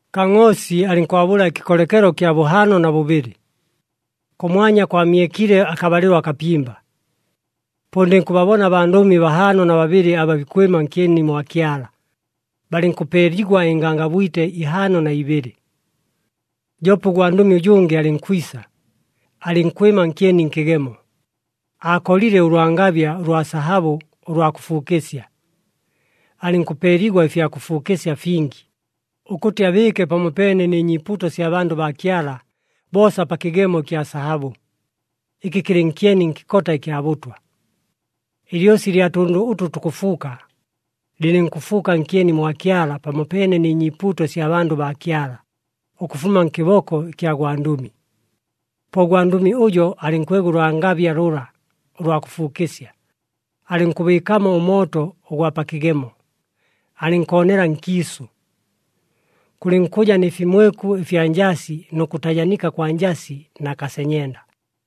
Kangʼoosi alɨnkwabʉla ɨkɨkolekelo ɨkya bʉhaano na bʉbɨlɨ. Kʉmwanya kwamyekile akabalɨlo akapimba. Po ndɨnkʉbabona abandʉmi bahaano na babɨlɨ aba bikwɨma nkyeni mwa Kyala, balɨnkʉpeeligwa ɨngangabwite ihaano na ibɨlɨ. Joope ʉgwandʉmi ʉjʉngɨ alɨnkwisa, alɨnkwɨma nkyeni nkɨgemo, aakolile ʉlwangabya ʉlwa sahabʉ ʉlwa kʉfuukɨsya. Alɨnkʉpeeligwa ɨfya kʉfuukɨsya fingi, ʉkʉtɨ abɨɨke pamopeene nɨ nyiipuuto sya bandʉ baa Kyala boosa pa kɨgemo ɨkya sahabʉ, ɨkɨ kɨlɨ nkyeni nkɨkota ɨkya bʉtwa. Ɨlyosi ɨlya tʉndʉ ʉtʉ tukʉfuuka, lɨlɨnkʉfuuka nkyeni mwa Kyala pamopeene nɨ nyiipuuto ɨsya bandʉ baa Kyala, ʉkʉfuma nkɨboko ɨkya gwandʉmi. Po ʉgwandʉmi ʉjo alɨnkwega ʉlwangabya lʉla ʉlwa kʉfuukɨsya, alɨnkʉbɨɨkamo ʉmooto ʉgwa pa kɨgemo, alɨnkoonela nkiisʉ. Kʉlɨnkʉja nɨ fimweku ɨfya njasi nʉ kʉtajanika kwa njasi na kasenyenda.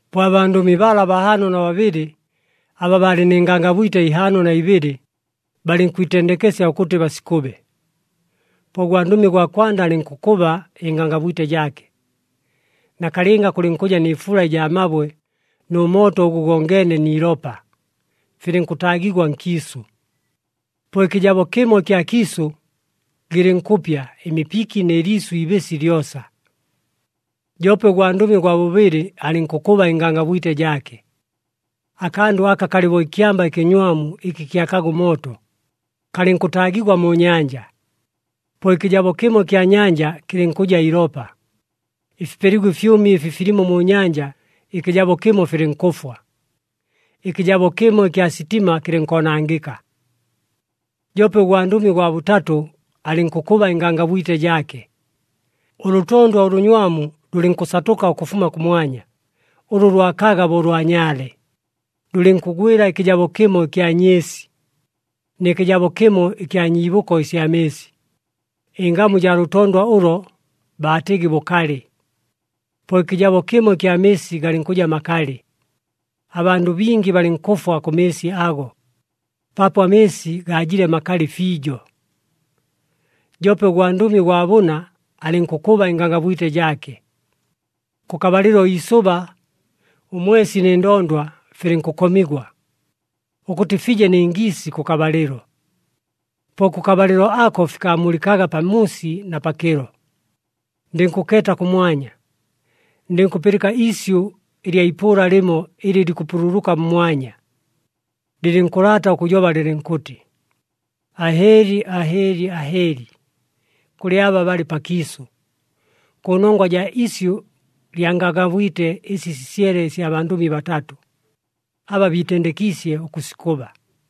Po abandʉmi bala bahaano na babɨlɨ aba baalɨ nɨ ngangabwite ihaano na ibɨlɨ, balɨnkwitendekesya ʉkʉtɨ basikʉbe. Po ʉgwandʉmi ʉgwa kwanda alɨnkʉkʉba ɨngangabwite jaake. Nakalɨnga kʉlɨnkʉja nɨ fula ɨjaa mabwe nʉ mooto ʉgʉ gongeene ni ilopa, filɨnkʉtaagigwa nkiisʉ. Po ɨkɨjabo kɨmo ɨkya kiisʉ gɨlɨnkʉpya ɨmipiki nɨ liisʉ iibɨsi lyosa. Joope ʉgwandʉmi ʉgwa bʉbɨlɨ alɨnkʉkʉba ɨngangabwite jaake. Akandʉ aka kalɨ bo ɨkyamba ɨkɨnywamu ɨkɨ kyakaga ʉmooto, kalɨnkʉtaagigwa mu nyanja. Po ɨkɨjabo kɨmo ɨkya nyanja kɨlɨnkʉja ilopa, ɨfipeligwa ɨfyʉmi ɨfi filimo mu nyanja ɨkɨjabo kɨmo filɨnkʉfwa, ɨkɨjabo kɨmo ɨkya sitima kɨlɨnkoonangɨka. Joope ʉgwandʉmi ʉgwa bʉtatʉ alɨnkʉkʉba ɨngangabwite jaake. Ʉlʉtondwa ʉlʉnywamu lʉlɨnkʉsatʉka ʉkʉfuma kʉmwanya, ʉlʉ lwakaga bo ʉlwa nyaale, lʉlɨnkʉgwɨla ɨkɨjabo kɨmo ɨkya nyɨɨsi, nɨ kɨjabo kɨmo ɨkya nyiibʉko ɨsya mɨɨsi. Ɨngamu jaa lʉtondwa ʉlo baatɨgɨ Bʉkalɨ. Po ɨkɨjabo kɨmo ɨkya mɨɨsi galɨnkʉja makalɨ. Abandʉ bingi balɨnkʉfwa kʉ mɨɨsi ago, paapo amɨɨsi gaajile makalɨ fiijo. Joope ʉgwandʉmi ʉgwa bʉna alɨnkʉkʉba ɨngangabwite jaake. Kʉkabalɨlo iisʉba, ʉmwesi nɨ ndondwa filɨnkʉkomigwa, ʉkʉtɨ fije nɨ ngiisi kʉkabalɨlo. Po kʉkabalɨlo ako fikaamulɨkaga pamuusi na pakɨlo. Ndɨnkʉkeeta kʉmwanya. Ndɨnkʉpɨlɨka iisyʉ ɨlya ipʉʉla lɨmo ɨlɨ likʉpululuka mmwanya, lɨlɨnkʉlaata ʉkʉjoba lɨlɨnkʉtɨ, “Ahɨɨli! Ahɨɨli! Ahɨɨli! Kʉlɨ aba balɨ pakiisʉ! Kʉnongwa jaa isyʉ lya ngangabwite ɨsi sisyele ɨsya bandʉmi batatʉ, aba biitendekiisye ʉkʉsikʉba.”